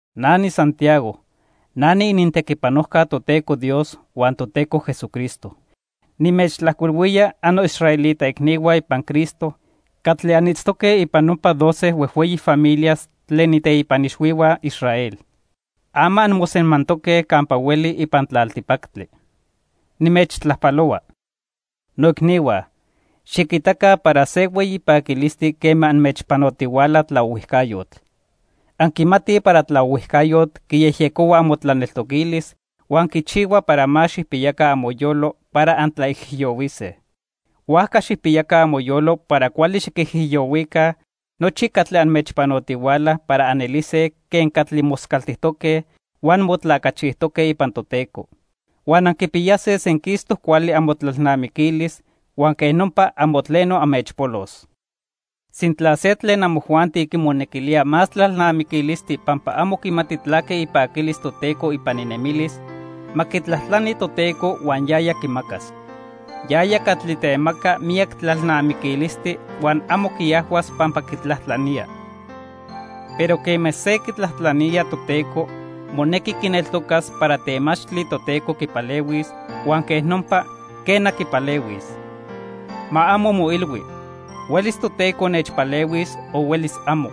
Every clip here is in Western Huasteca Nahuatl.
Na niSantiago. Na niinintequipanojca Toteco Dios huan Toteco Jesucristo. Nimechtlajcuilhuía annoisraelita icnihua ipan Cristo catli anitztoque ipan nopa doce huejhueyi familias tlen iteipan ixhuihua Israel. Ama anmosemantoque campa hueli ipan tlaltipactli. Nimechtlajpalohua. Noicnihua, xiquitaca para se hueyi paquilistli quema anmechpanotihuala tlaohuijcayotl. Anquimatij para tlaohuijcayotl quiyejyecohua amotlaneltoquilis huan quichihua para más xijpiyaca amoyolo para antlaijiyohuise. Huajca xijpiyaca amoyolo para cuali xiquijiyohuica nochi catli anmechpanotihuala para anelise quen catli moscaltijtoque huan motlacachijtoque ipan Toteco. Huan anquipiyase senquistoc cuali amotlalnamiquilis huan quej nopa amo tleno anmechpolos. Sintla se tlen amojuanti quimonequilía más tlalnamiquilistli pampa amo quimati tlaque ipaquilis Toteco ipan inemilis, ma quitlajtlani Toteco huan yaya quimacas. Yaya catli temaca miyac tlalnamiquilistli, huan amo quiajhuas pampa quitlajtlanía. Pero quema se quitlajtlanía Toteco, monequi quineltocas para temachtli Toteco quipalehuis, huan quej nopa, quena, quipalehuis. Ma amo moilhui: "Huelis Toteco nechpalehuis o huelis amo."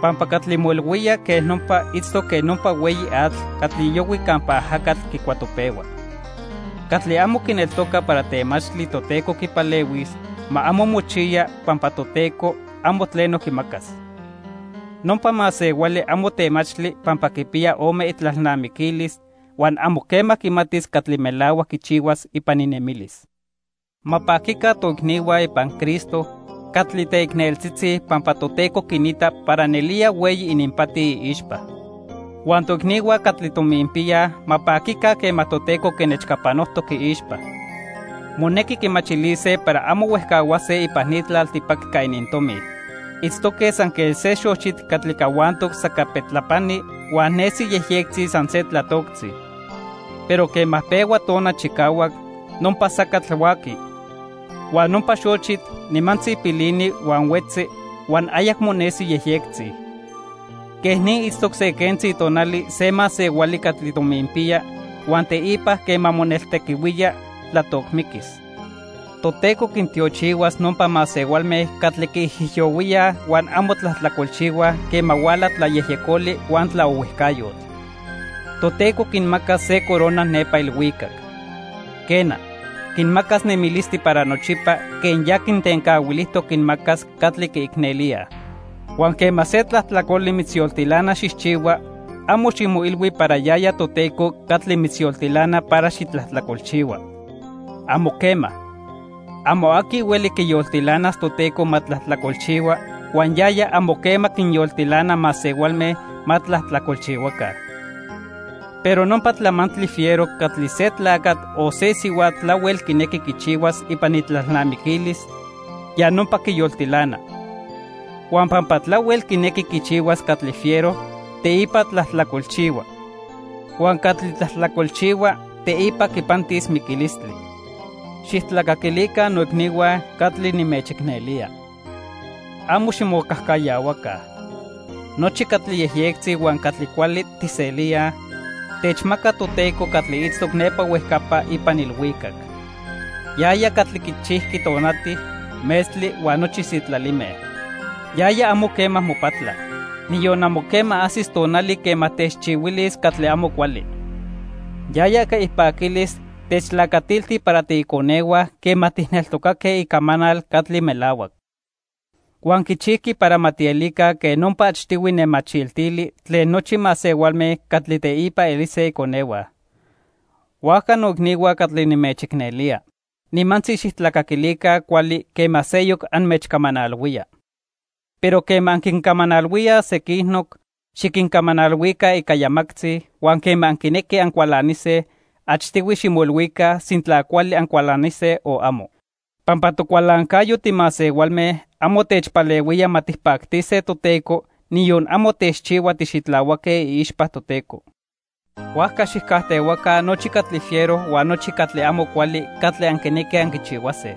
Pampa catli moilhuía quej nopa itztoc quen nopa hueyi atl catli yohui campa ajacatl quicuatopehua. Catli amo quineltoca para temachtli Toteco quipalehuis, ma amo mochiya, pampa Toteco amo tleno quimacas. Nopa masehuali amo temachtli pampa quipiya ome itlalnamiquilis, huan amo quema quimatis catli melahuac quichihuas ipan inemilis. Ma paquica toicnihua ipan Cristo catli teicneltzitzi pampa Toteco quinita para nelía hueyi ininpati iixpa. Huan toicnihua catli tominpiyaj ma paquica quema Toteco quinechcapanojtoc iixpa. Monequi quimachilise para amo huejcahuase ipan ni tlaltipactli ica inintomi. Itztoque san quen se xochitl catli cahuantoc sacapetlapani huan nesi yejyectzi san se tlatoctzi. Pero quema pehua tona chicahuac, nopa sacatl huaqui. Huan nopa xochitl nimantzi pilini huan huetzi, huan ayacmo nesi yejyectzi. Quej ni itztoc se quentzi tonali se masehuali catli tominpiya huan teipa quema moneltequihuía, tlatocmiquis. Toteco quintiochihuas nopa masehualme catli quiijiyohuíaj huan amo tlajtlacolchihuaj quema huala tlayejyecoli huan tlaohuijcayotl. Toteco quinmacas se corona nepa ilhuicac. Quena, quinmacas nemilistli para nochipa quen ya quintencahuilijtoc quinmacas catli quiicnelíaj. Huan quema se tlajtlacoli mitzyoltilana xijchihua, amo ximoilhui para yaya Toteco catli mitzyoltilana para xitlajtlacolchihua. ¡Amo quema! Amo aqui hueli quiyoltilanas Toteco ma tlajtlacolchihua huan yaya amo quema quinyoltilana masehualme ma tlajtlacolchihuaca. Pero nopa tlamantli fiero catli se tlacatl o se sihuatl tlahuel quinequi quichihuas ipan itlalnamiquilis, ya nopa quiyoltilana. Huan pampa tlahuel quinequi quichihuas catli fiero, teipa tlajtlacolchihua. Huan catli tlajtlacolchihua, teipa quipantis miquilistli. Xijtlacaquilica, noicnihua catli nimechicnelía. Amo ximocajcayahuaca. Nochi catli yejyectzi huan catli cuali tijselíaj, techmaca Toteco catli itztoc nepa huejcapa ipan ilhuicac. Yaya catli quichijqui tonati, metztli huan nochi sitlalime. Yaya amo quema mopatla. Niyon amo quema ajsis tonali quema techchihuilis catli amo cuali. Yaya ica ipaquilis techtlacatilti para tiiconehua quema tijneltocaque icamanal catli melahuac. Huan quichijqui para ma tielica quen nopa achtihui nemachiltili tlen nochi masehualme catli teipa elise iconehua. Huajca noicnihua catli nimechicnelía, nimantzi xijtlacaquilica cuali quema seyoc anmechcamanalhuía. Pero quema anquincamanalhuíaj sequinoc, xiquincamanalhuica ica yamactzi, huan quema anquinequij ancualanise, achtihui ximoilhuica sintla cuali ancualanise o amo. Pampa tocualancayo timasehualme amo techpalehuía ma tijpactise Toteco, niyon amo techchihua tixitlahuaque iixpa Toteco. Huajca xijcajtehuaca nochi catli fiero huan nochi catli amo cuali catli anquinequij anquichihuase.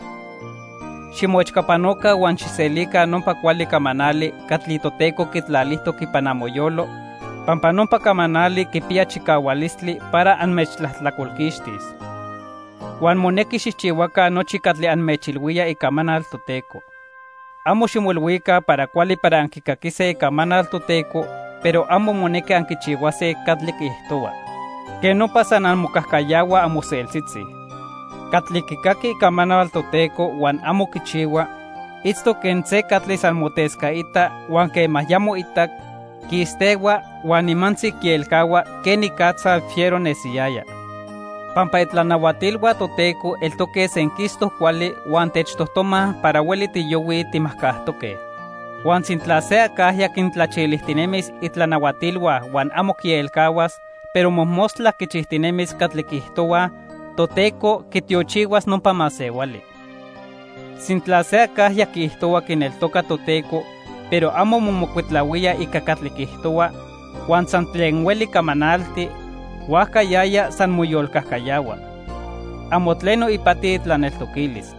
Ximoechcapanoca huan xijselica nopa cuali camanali catli Toteco quitlalijtoc ipan amoyolo, pampa nopa camanali quipiya chicahualistli para anmechtlajtlacolquixtis. Huan monequi xijchihuaca nochi catli anmechilhuía icamanal Toteco. Amo ximoilhuica para cuali para anquicaquise Icamanal Toteco pero amo monequi anquichihuase catli quiijtohua. Quej nopa san anmocajcayahuaj amoseltzitzi. Catli quicaqui Icamanal Toteco huan amo quichihua, itztoc quen se catli san motescaita, huan quema ya moitac, quistehua, huan nimantzi quielcahua quenicatza fiero nesiyaya. Pampa itlanahuatilhua Toteco eltoque senquistoc cuali huan techtojtomaj para hueli tiyohuij timajcajtoque. Huan sintla se acajya quintlachilijtinemis itlanahuatilhua huan amo quielcahuas, pero mojmostla quichijtinemis catli quiijtohuaj, Toteco quitiochihuas nopa masehuali. Sintla se acajya quiijtohua quineltoca Toteco, pero amo momocuitlahuía ica catli quiijtohua; huan san tlen hueli camanalti, huajca yaya san moyolcajcayahua. Amo tleno ipati itlaneltoquilis.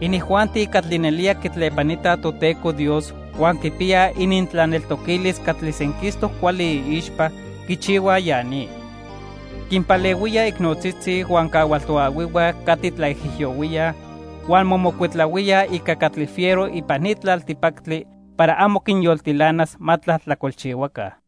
Inijuanti catli nelía quitlepanitaj Toteco Dios huan quipiyaj inintlaneltoquilis catli senquistoc cuali iixpa, quichihuaj ya ni: quinpalehuíaj icnotzitzi huan cahual toahuihua catli tlaijiyohuíaj, huan momocuitlahuíaj ica catli fiero ipan ni tlaltipactli para amo quinyoltilanas ma tlajtlacolchihuaca.